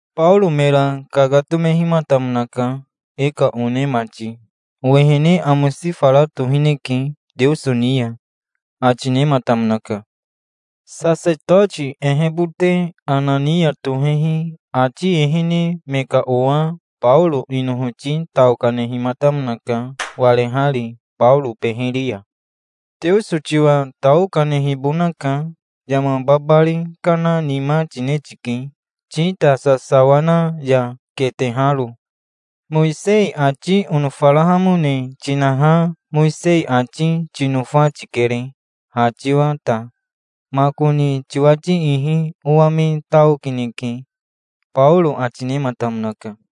Baoro mera kakatomehimatamonaka. "E ka one mati, owehene amosi fara tohineke Teoso ni ya", ati nematamonaka. Sasetoti ehebote Anania tohehi ati ehene me ka owa Baoro inohoti tao kanehimatamonaka, warehari Baoro beheri ya. "Teoso tiwa tao kanehibonaka. Yama babari kana nima tine tike, tita sasawa na ya keteharo. Mowisei ati onofarahamone tinaha Mowisei ati tinofa tikere, ha tiwa ta. Makoni tiwati ihi owa me tao kineke", Baoro ati nematamonaka.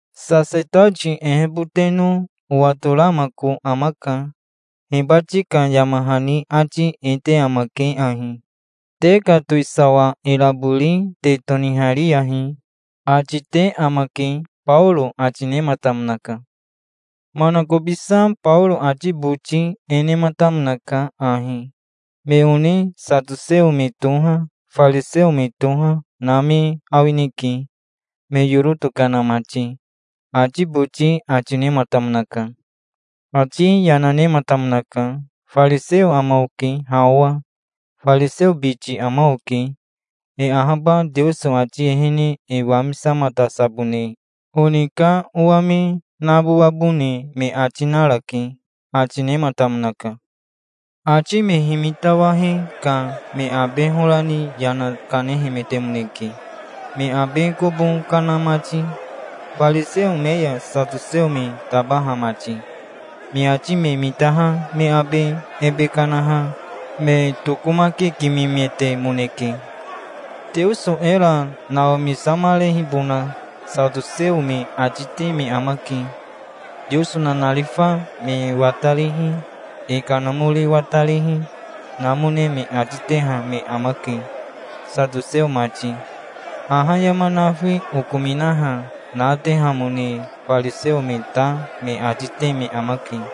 "Sasetoti eheboteno owatoramako amaka. Hibati ka yama hani ati e te amake ahi: 'Te ka towisawa irabori te tonihariyahi', ati te amake", Baoro ati nematamonaka. Manakobisa Baoro ati boti e nematamonaka ahi: "Me one satoseo me toha, fariseo me toha, na me awineke, me yoro tokana mati", ati boti ati nematamonaka. Ati yana nematamonaka. "Fariseo ama oke ha owa. Fariseo biti ama oke. E ahaba Teoso ati ehene e wamisamatasabone oni ka owa me nabowabone me ati narake", ati nematamonaka. Ati me himitawahe ka me abe hora ni yana kanehemetemoneke, me abe kobo kana mati, fariseo me ya satoseo me tabaha mati. Me ati me mitaha me abe ebe kanaha me tokomakikimemetemoneke. Teoso era nawamisamarehibona satoseo me ati te me amake. Teoso nanarifa me watarihi, e kanamori watarihi, namone me ati teha me amake, satoseo mati. Haha yama nafi okominaha natehamone fariseo me ta me ati te me amake.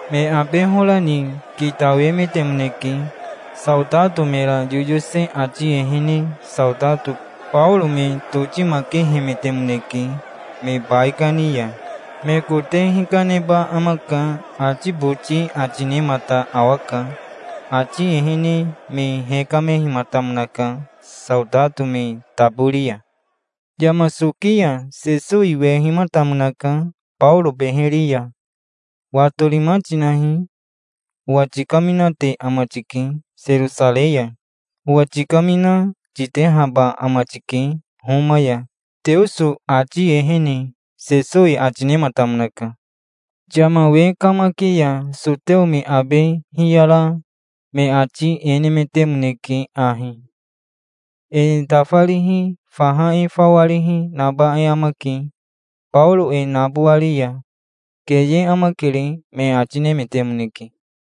Me abe hora ni kitawemetemoneke. Saotato mera yoyose ati ehene saotato Baoro me totimakehemetemoneke, me baikani ya. "Me kote hikaneba amaka", ati boti ati nemata awaka. Ati ehene me hekamehimatamonaka saotato me tabori ya. Yama soki ya Sesowi wehimatamonaka Baoro beheri ya. "Watorima tinahi. Owa tikaminate ama tike Serosarei ya. Owa tikamina, titehaba ama tike Homa ya Teoso ati ehene", Sesowi ati nematamonaka. Yama we kamaki ya soteo me abe hiyara me ati e nemetemoneke ahi: "E tafarihi, faha e fawarihi, naba e amake, Baoro e nabowari ya. Keye amakere", me ati nemetemoneke.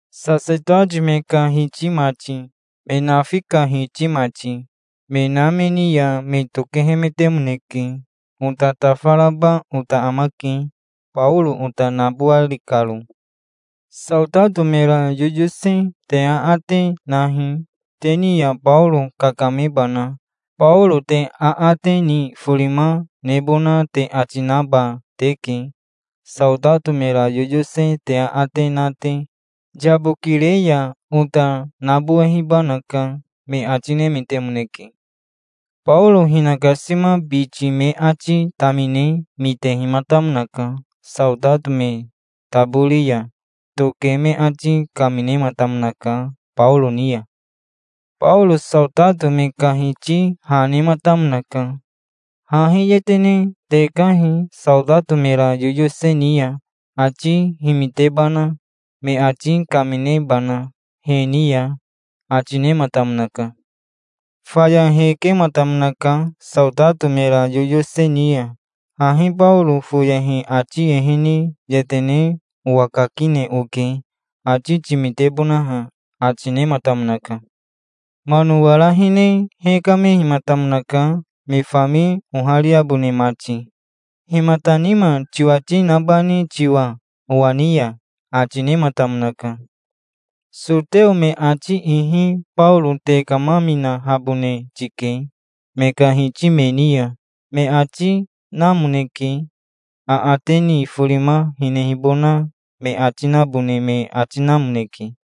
Sasetoti me ka hiti mati, me nafi ka hiti mati, me na me ni ya me tokehemetemoneke. "Ota tafaraba ota amake, Baoro ota nabowari karo. Saotato mera yoyose te aate nahi, te ni ya Baoro kakamebana. Baoro te aate ni forima nebona te ati naba teke, saotato mera yoyose te aate na te. Yabokire ya ota nabowehibanaka", me ati nemetemoneke. Baoro hinakasima biti me ati tamine mitehimatamonaka. Saotato me tabori ya toke me ati kaminematamonaka Baoro ni ya. Baoro saotato me ka hiti ha nematamonaka. "Hahi yetene tekahi saotato mera yoyose ni ya, ati himitebana, me ati kaminebana he ni ya", ati nematamonaka. Faya hekematamonaka saotato mera yoyose ni ya. "Hahi Baoro foyehi ati ehene yetene owakakine oke, ati timitebonaha", ati nematamonaka. Mano wara hine hekamehimatamonaka me fami ohariabone mati. "Himata nima tiwati nabani tiwa owa ni ya?" ati nematamonaka. "Soteo me ati ihi Baoro tekamaminahabone tike me ka hiti me ni ya, me ati namoneke. Aate ni forima hinehibona me ati nabone me ati namoneke.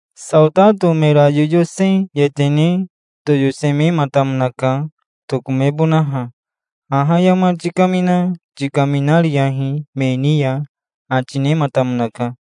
Saotato mera yoyose yetene toyosemematamonaka, tokomebonaha. "Haha yama tikamina tikaminariyahi me ni ya", ati nematamonaka.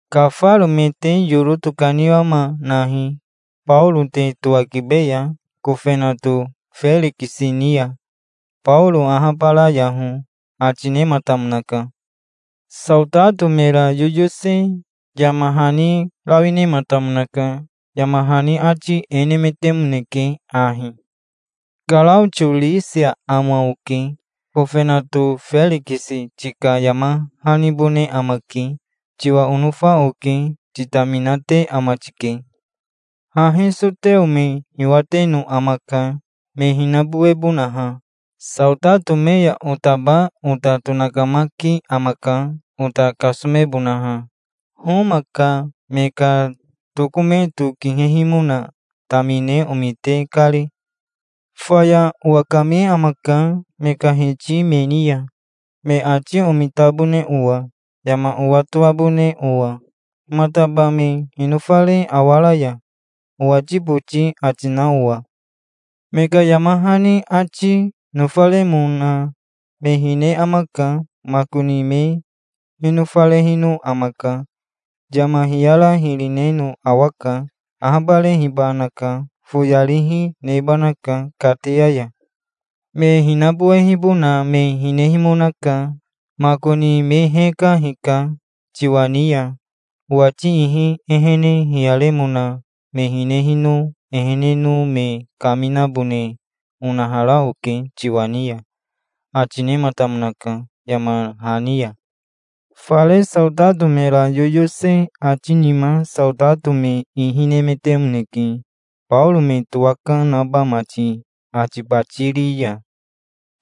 Kafaro me te yoro tokaniwama nahi, Baoro te towakibeya kofenato Ferikisi ni ya. Baoro ahabarayaho", ati nematamonaka. Saotato mera yoyose yama hani rawi nematamonaka. Yama hani ati e nemetemoneke ahi: "Karaotio Risia ama oke. Kofenato Ferikisi tika yama hanibone amake. Tiwa onofa oke. Titaminate ama tike. Hahi soteo me hiwateno amaka, me hinabowebonaha. Saotato me ya otaba ota tonakamaki amaka, ota kasomebonaha, Homa ka me ka tokometo kihehimona tamine omite kari. Faya owakame amaka me ka hiti me ni ya, me ati omitabone owa, yama owatoabone owa, 'Himataba me hinofare awaraya', owati boti ati na owa. Me ka yama hani ati nofaremona me hine amaka. Makoni me hinofarehino amaka. Yama hiyara hiri reno awaka. Ahabarehibanaka. Foyarihi, nebanaka kateya ya. Me hinabowehibona me hinehimonaka. Makoni me heka hika tiwa ni ya owati ihi. Ehene hiyaremona me hinehino eheneno me kaminabone onahara oke tiwa ni ya", ati nematamonaka yama hani ya. Fare saotato mera yoyose ati nima saotato me ihi nemetemoneke, Baoro me towaka naba mati Atibatiri ya.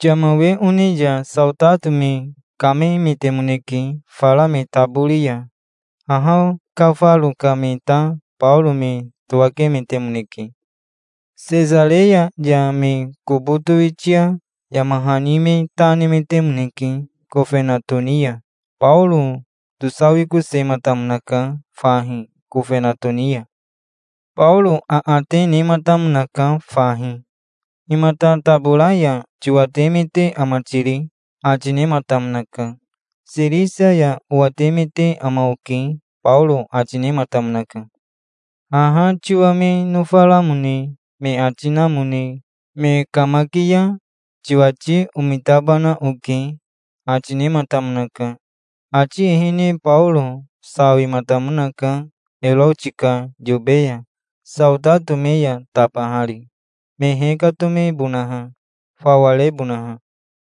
Yama we one ya saotato me kamemetemoneke fara me tabori ya. Haha kafaro ka me ta Baoro me towakemetemoneke. Sesareya ya me kobo towitia yama hani me ta nemetemoneke kofenato ni ya. Baoro tosawikosematamonaka fahi kofenato ni ya. Baoro aate nematamonaka fahi. "Himata tabora ya tiwatemete ama tiri?" ati nematamonaka. "Sirisia ya owatemete ama oke", Baoro ati nematamonaka. "Haha tiwa me nofaramone me ati namone me kamaki ya tiwati omitabana oke", ati nematamonaka. Ati ehene Baoro sawimatamonaka Eroti ka yobe ya, saotato me ya tabahari, me hekatomebonaha, fawa rebonaha.